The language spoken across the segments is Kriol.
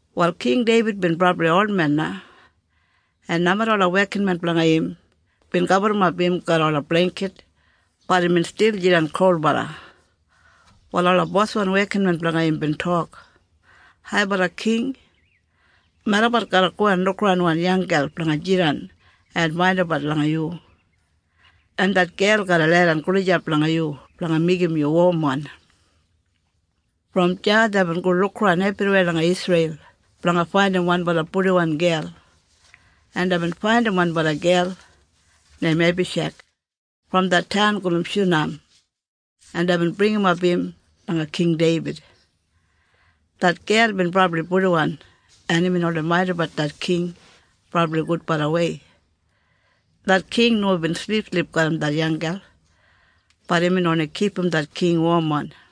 Wal King Deibid bin brabli olmen na, en nomeda ola wekinmen blanga im bin gaburrumap im garram ola bleingkit, bat imbin stil jidan kolbala. Wal ola boswan wekinmen blanga im bin tok, “Haibala King, melabat garra go en lukaran wan yanggel blanga jidan en maindimbat langa yu. En det gel garra leidan gulijap langa yu blanga meigim yu womwan.” Brom deya deibin go lukaran ebriweya langa Isreil blanga faindim wanbala purdiwan gel, en deibin faidim wanbala gel neim Ebisheg brom det taun gulum Shunam en deibin bringimap im langa King Deibid. Det gel bin brabli purdiwan en imbin oldei maindimbat det king brabli gudbalawei. Det king nomo bin silipsilip garram det yanggel. Bat imbin oni kipum det king womwan.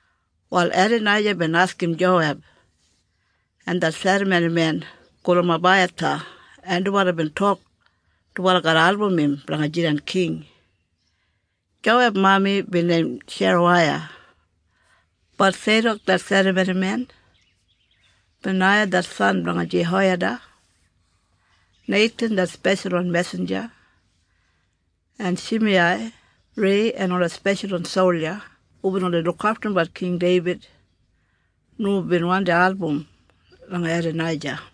Wal Edanaija bin askim Joweb, en det serramonimen gulum Abaiyatha, en dubala bin tok dubala garra album im blanga jidan king. Joweb mami bin neim Seruwaiya. Bat Seidok det serramonimen, Benaiya det san blanga Jehoiyada, Neithan det speshalwan mesinja, en Shimiyai, Rei, en ola speshalwan solja hubin oldei lukaftumbat King Deibid nomo bin wandi album langa Edanaija.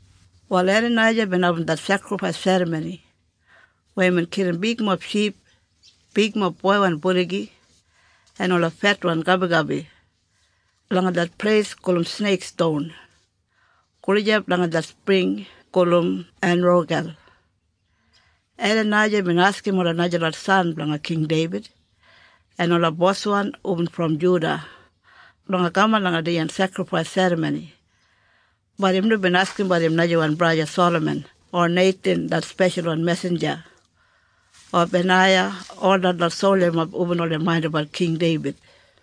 Wal Edanaija bin abum det sekrifais serramoni weya imbin kilim bigmob ship, bigmob boiwan buligi en ola fetwan gabigabi langa det pleis gulum Sneik Ston, gulijap langa det spring gulum Enrogel. Edanaija bin askim ola najalot san blanga King Deibid, en ola boswan hubin brom Juda, blanga kaman langa dijan sekrifais serramoni. Bat im nomo bin askimbat im najawan braja Salaman o Neithan det speshalwan mesinja, o Benaiya, o detlot soljamob hubin oldei maindimbat King Deibid.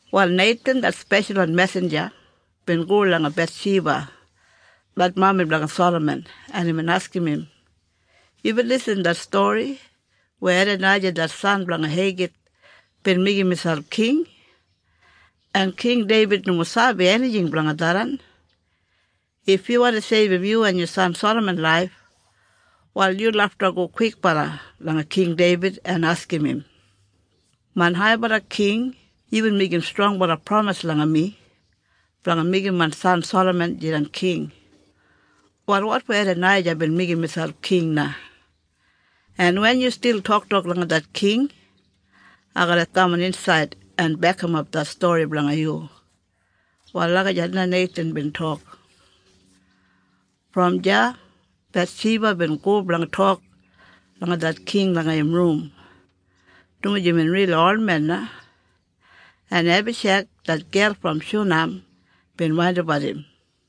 Wal Neithan det speshalwan mesinja bin go langa Bethsheba det mami blanga Salaman en imbin askim im, “Yubin lisin det stori weya Edanaija det san blanga Heigith bin meigim miselp king? En King Deibid nomo sabi enijing blanga tharran. If yu wandi seibum yu en yu san Salaman laif, wal yu lafta go kwikbala langa King Deibid en askim im, ‘Main Haibala King yubin meigim strongbala pramis langa mi blanga meigim main san Salaman jidan king. Wal wotfo Edanaija bin meigim miselp king na?’ En wen yu stil toktok langa det king, ai garra kaman insaid en bekimap det stori blanga yu.” Wal lagijat na Neithan bin tok. Brom deya Bethsheba bin go blanga tok langa det king langa im rum, dumaji imbin rili olmen na, en Ebisheg, det gel brom Shunam bin maindimbat im.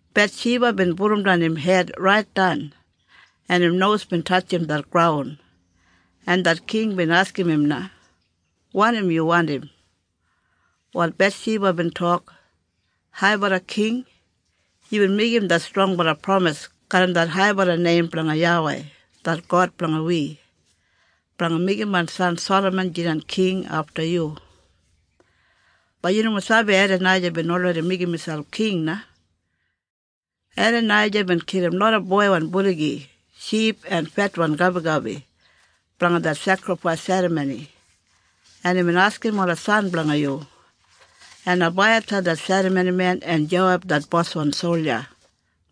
Bethsheba bin pudumdan im hed raitdan en im nos bin tatjim det graun en det king bin askim im na, “Wanim yu wandim?” Wal Bethshiba bin tok, “Haibala King, yubin meigim det strongbala pramis garram det haibala neim blanga YAWEI det God blanga wi, blanga meigim main san Salaman jidan king afta yu. Bat yu nomo sabi Edanaija bin olredi meigim miselp king na. Edanaija bin kilim loda boiwan buligi, ship en fetwan gabigabi, blanga det sekrifais serramoni, en imbin askim ola san blanga yu, en Abaiyatha det serramonimen, en Joweb det boswan solja,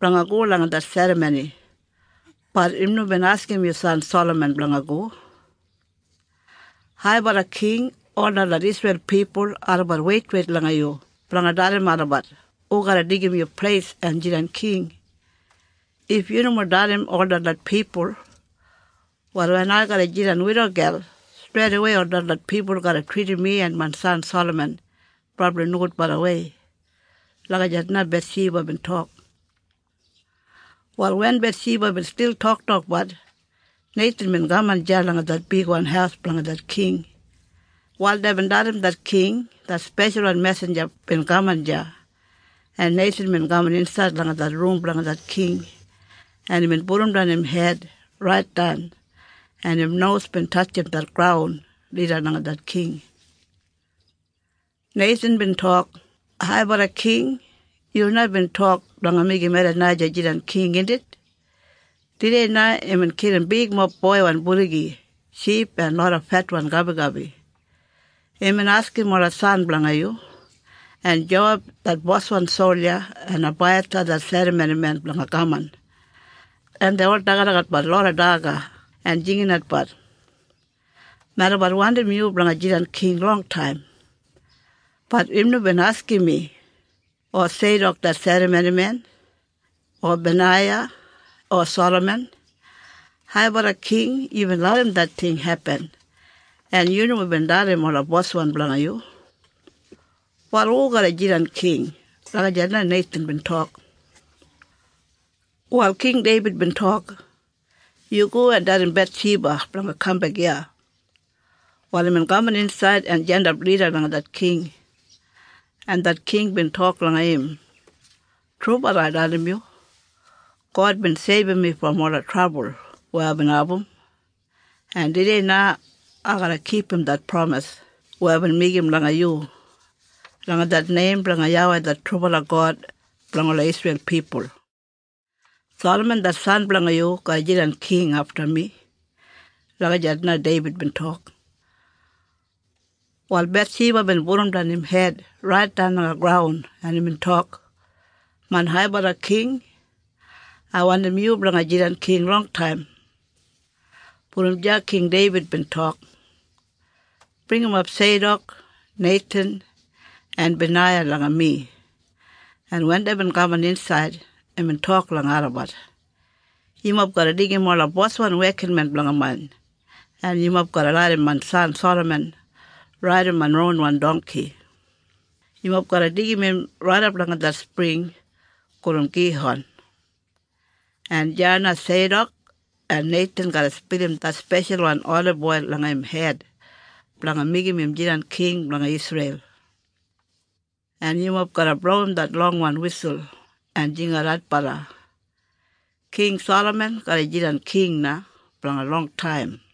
blanga go langa det serramoni, bat im nomo bin askim yu san Salaman blanga go. Haibala King, ol detlot Isreil pipul, olabat weitweit langa yu blanga dalim olabat hu garra deigim yu pleis en jidan king. If yu nomo dalim ol detlot pipul, wal wen ai garra jidan widogel, streidawei ol detlot pipul garra tridim mi en main san Salaman brabli nogudbalawei.” Lagijat na Bethshiba bin tok. Wal wen Bethshiba bin stil toktokbat, Neithan bin kaman deya langa det bigwan haus blanga det king. Wal deibin dalim det king det speshalwan mesinja bin kaman deya. En Neithan bin kaman insaid langa det rum blanga det king en imbin pudumdan im hed raitdan en im nos bin tatjim det graun lida langa det king. Neithan bin tok, “Haibala King, yu na bin tok blanga meigim Edanaija jidan king, indit? Tudei na imbin kilim bigmob boiwan buligi, ship en loda fetwan gabigabi. Imbin askim ola san blanga yu, en Joweb det boswan solja, en Abaiyatha det serramonimen blanga kaman, en dei ol dagadagatbat loda daga en jinginatbat, ‘Melabat wandim yu blanga jidan king longtaim.’ Bat im nomo bin askim mi, o Seidok det serramonimen, o Benaiya, o Salaman. Haibala King, yubin larram det ting hepin en yu nomo bin dalim ola boswan blanga yu? Wal hu garra jidan king?” Lagijat na Neithan bin tok. Wal King Deibid bin tok, “Yu go en dalim Bethsheba blanga kambek iya.” Wal imbin kaman insaid en jandap lida langa det king. En det king bin tok langa im, “Trubala ai dalim yu. God bin seibum mi brom ola trabul weya aibin abum. En tudei na ai garra kipum det pramis weya aibin meigim langa yu, langa det neim blanga YAWEI det trubala God blanga ola Isreil pipul. Salaman det san blanga yu garra jidan king afta mi.” Lagijat na Deibid bin tok. Wal Bethsheba bin pudumdan im hed raitdan langa graun en imbin tok, “Main Haibala King, ai wandim yu blanga jidan king longtaim.” Brom deya King Deibid bin tok, “Bringimap Seidok, Neithan, en Benaiya langa mi.” En wen deibin kaman insaid, imbin tok langa olabat, “Yumob garra deigim ola boswan wekinmen blanga main en yumob garra larram main san Salaman raidim main ronwan dongki. Yumob garra go en deigim im raidap langa det spring gulum Gihon. En deya na Seidok en Neithan garra spilim det speshalwan oliboil langa im hed blanga meigim im jidan king blanga Isreil. En yumob garra blowim det longwan wisul en jingat adbala, ‘King Salaman garra jidan king na blanga longtaim.’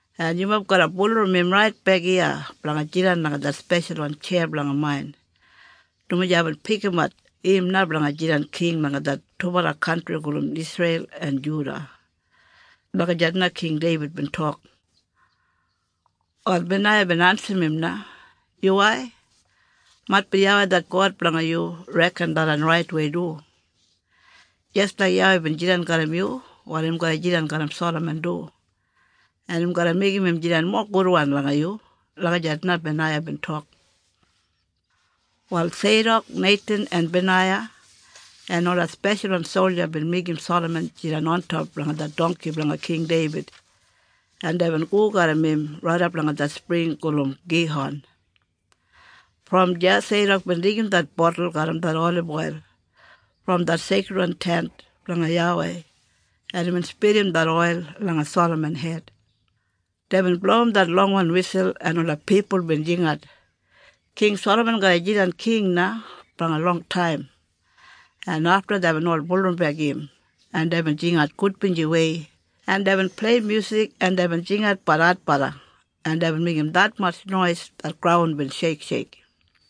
En yumob garra bulurrum im raitbek iya blanga jidan langa det speshalwan tjeya blanga main, dumaji aibin pikimat im na blanga jidan king langa det dubala kantri gulum Isreil en Juda.” Lagijat na King Deibid bin tok. Wal Benaiya bin ensim im na, “Yuwai, maitbi YAWEI det God blanga yu reken tharran raitwei du. Jis laik YAWEI bin jidan garram yu, wal im garra jidan garram Salaman du, en im garra meigim im jidan mowa gudwan langa yu.” Lagijat na Benaiya bin tok. Wal Seidok, Neithan en Benaiya en ola speshalwan solja bin meigim Salaman jidan ontop langa det dongki blanga King Deibid en deibin go garram im raidap langa det spring gulum Gihon. Brom deya Seidok bin deigim det botul garram det oliboil brom det Seikridwan Tent blanga YAWEI en imbin spilim det oil langa Salaman hed. Deibin blowim det longwan wisul en ola pipul bin jingat, “King Salaman garra jidan king na blanga longtaim.” En afta deibin ol bulurrumbek im en deibin jingat gudbinjiwei en deibin plei myusik en deibin jingatbat adbala en deibin meigim detmatj nois det graun bin sheiksheik.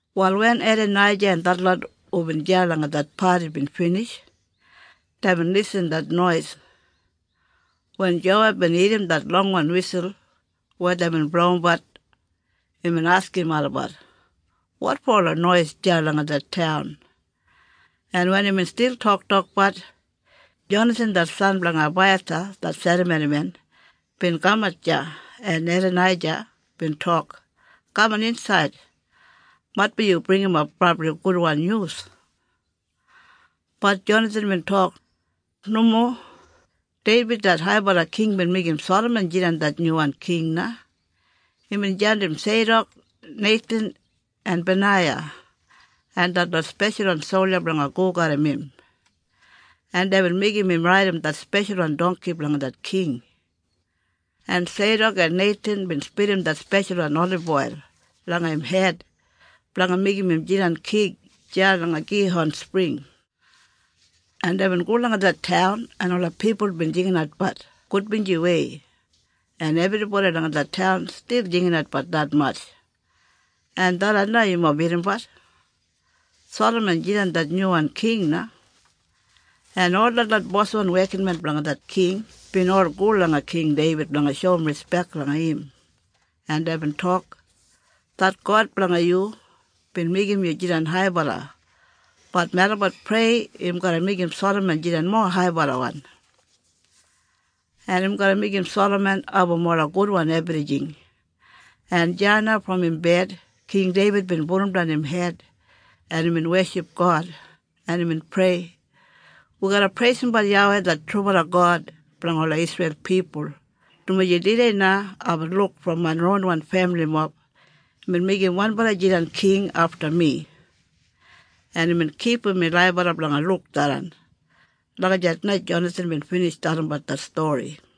Wal wen Edanaija en detlot hu bin deya langa det padi bin binij, deibin lisin det nois. Wen Joweb bin irrim det longwan wisul weya deibin blowimbat imbin askim olabat, “Wotfo ola nois deya langa det taun?” En wen imbin stil toktokbat, Jonathan det san blanga Ebaiyatha, det serramonimen, bin kamat deya en Edanaija bin tok, “Kaman insaid. Maitbi yu bringimap brabli gudwan nyus!” Bat Jonathan bin tok, “Nomo. Deibid det Haibala King bin meigim Salaman jidan det nyuwan king na. Imbin jandim Seidok, Neithan en Benaiya en detlot speshalwan solja blanga go garram im. En deibin meigim im raidim det speshalwan dongki blanga det king. En Seidok en Neithan bin spilim det speshalwan oliboil langa im hed blanga meigim im jidan king deya langa Gihon Spring. En deibin go langa det taun en ola pipul bin jinginatbat gudbinjiwei en ebribodi langa det taun stil jinginatbat detmatj, en tharran na yumob irrimbat. Salaman jidan det nyuwan king na. En ol detlot boswan wekinmen blanga det king bin ol go langa King Deibid blanga shoum rispek langa im, en deibin tok, ‘Det God blanga yu bin meigim yu jidan haibala bat melabat prei im garra meigim Salaman jidan mowa haibalawan. En im garra meigim Salaman abum ola gudwan ebrijing.’ En deya na brom im bed, King Deibid bin pudumdan im hed en imbin weship God, en imbin prei, ‘Wi garra preisimbat YAWEI det trubala God blanga ola Isreil pipul, dumaji tudei na aibin luk brom main ronwan femilimob imbin meigim wanbala jidan king afta mi, en imbin kipum mi laibala blanga luk tharran.’” Lagijat na Jonathan bin binij dalimbat det stori.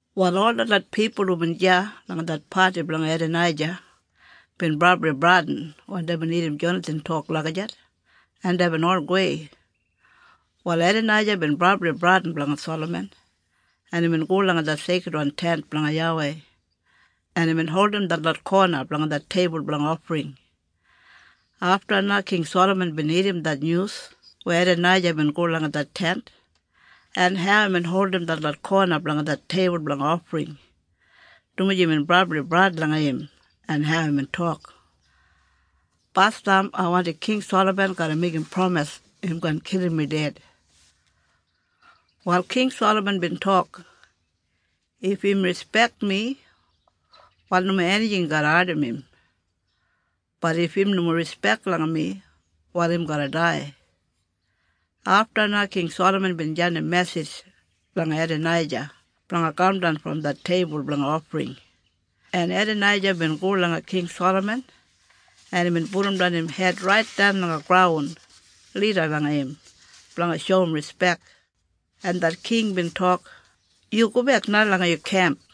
Wal ol detlot pipul hubin deya langa det padi blanga Edanaija bin brabli bradin wen deibin irrim Jonathan tok lagijat, en deibin ol gowei. Wal Edanaija bin brabli bradin blanga Salaman, en imbin go langa det Seikridwan Tent blanga YAWEI, en imbin holdim detlot kona blanga det teibul blanga ofring. Afta na King Salaman bin irrim det nyus weya Edanaija bin go langa det Tent en hau imbin holdim detlot kona blanga det teibul blanga ofring, dumaji imbin brabli bradin langa im, en hau imbin tok, “Basdam ai wandim King Salaman garra meigim pramis im kaan kilim mi ded.” Wal King Salaman bin tok, “If im rispek mi, wal nomo enijing garra ardim im, bat if im nomo rispek langa mi, wal im garra dai.” Afta na King Salaman bin jandim mesij langa Edanaija blanga kamdan brom det teibul blanga ofring, en Edanaija bin go langa King Salaman en imbin pudumdan im hed raitdan langa graun lida langa im blanga shoum rispek. En det king bin tok, “Yu gobek na langa yu kemp.”